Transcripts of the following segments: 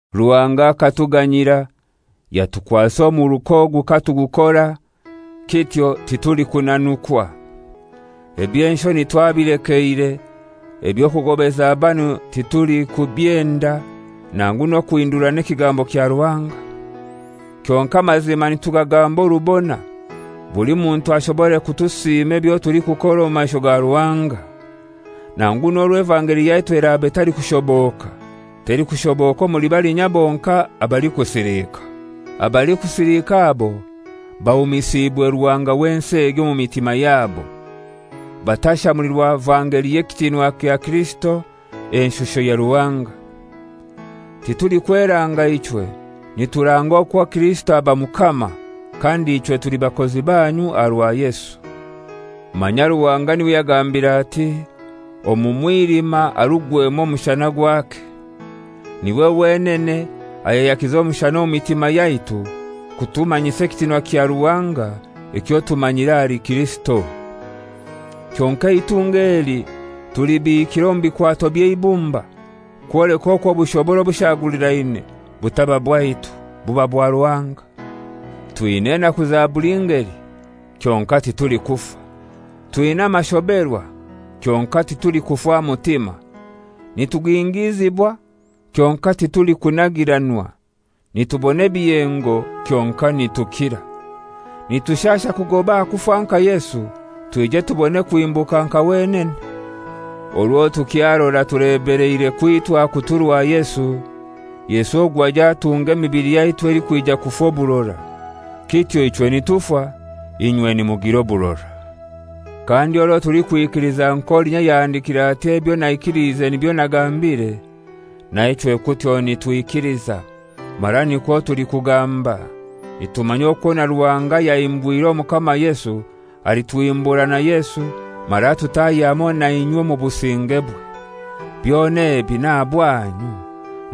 Ruhanga akatuganyira yatukwasa omuruka ogu katugukora, kityo titulikunanukwa. Eby'enshoni twabilekeire, eby'okugobeza banu titulikubyenda, nangu n'okuhindurana ekigambo kya Ruhanga. Kyonkai amazima nitugagamba orubona, buli muntu ashobore kutusiima ebyo tulikukora omu maisho ga Ruhanga. Nangu n'orwo evangeli yaitu eraba etalikushoboka, telikushoboka omuli balinya bonkai abalikusilika. Abalikusilika abo, bahumisiibwe ruhanga w'ensi egi omu mitima yabo, batashamulirwa vangeli y'ekitinwa kya Kirisito, enshusho ya Ruhanga. Titulikweranga ichwe, nituranga okwo Kirisito aba Mukama, kandi ichwe tuli bakozi banyu aha rwa Yesu. Manya Ruhanga n'iwe yagambire ati, «Omu mwilima harugwemu omushana gwake,» n'iwe wenene ayayakize omushana omu mitima yaitu kutumanyisa ekitinwa kya Ruhanga ekyo tumanyira ahali Kirisito. Kyonkai eitunga eli tulibiikire omu bikwato by'eibumba, kwoleka okwo obushobora obushagulirane butaba bwaitu, buba bwa Ruhanga. Twina enaku za buli ngeli, kyonkai titulikufa; twina amashoberwa kyonkai titulikufa mutima; nitugingizibwa kyonkai titulikunagiranwa; nitubona ebiyengo kyonkai nitukira. Nitushasha kugoba aha kufa nka Yesu, twije tubone kuhimbuka nka wenene. Orwo tukyarora tulebeleire kwitwa kuturwa Yesu, Yesu ogwo aije atunge emibili yaitu elikwija kufa oburora. Kityo ichwe nitufa, inywe nimugira oburora. Kandi orwo tulikwikiliza nk'olinya ayahandikiire ati, «Ebyo naikiliize nibyo nagambire,» na ichwe kutyo nitwikiliza, mara nikwo tulikugamba, nitumanya okwo na Ruhanga ayahimbwire Omukama Yesu alituhimbura na Yesu mara atutahye hamoi na inywe omu busingebwe. Byona ebi n'aha bwanyu,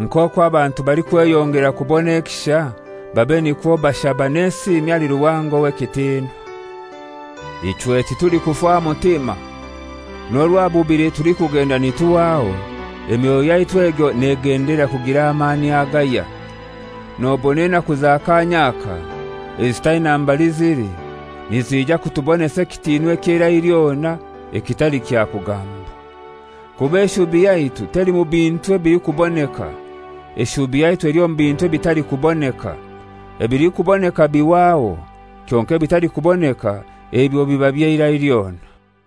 nk'okwo abantu balikweyongera kubona ekisha babe nikwo bashaba n'esiimi ahali Ruhanga ow'ekitinwa. Ichwe titulikufa mutima. N'orwo aha bubili tulikugenda nituhwaho, emyoyo yaitu egyo negendelera kugira amani agahya. Nobona enaku za kanya aka ezitaina mbali zili nizija kutubonesa ekitinwa eky'eirai lyona ekitali kya kugambwa. Kuba eshubi yaitu teli mu bintu ebilikuboneka; eshubi yaitu eli omu bintu ebitalikuboneka. Ebilikuboneka bihwaho, kyonkai ebitalikuboneka ebyo biba by'eira lyona.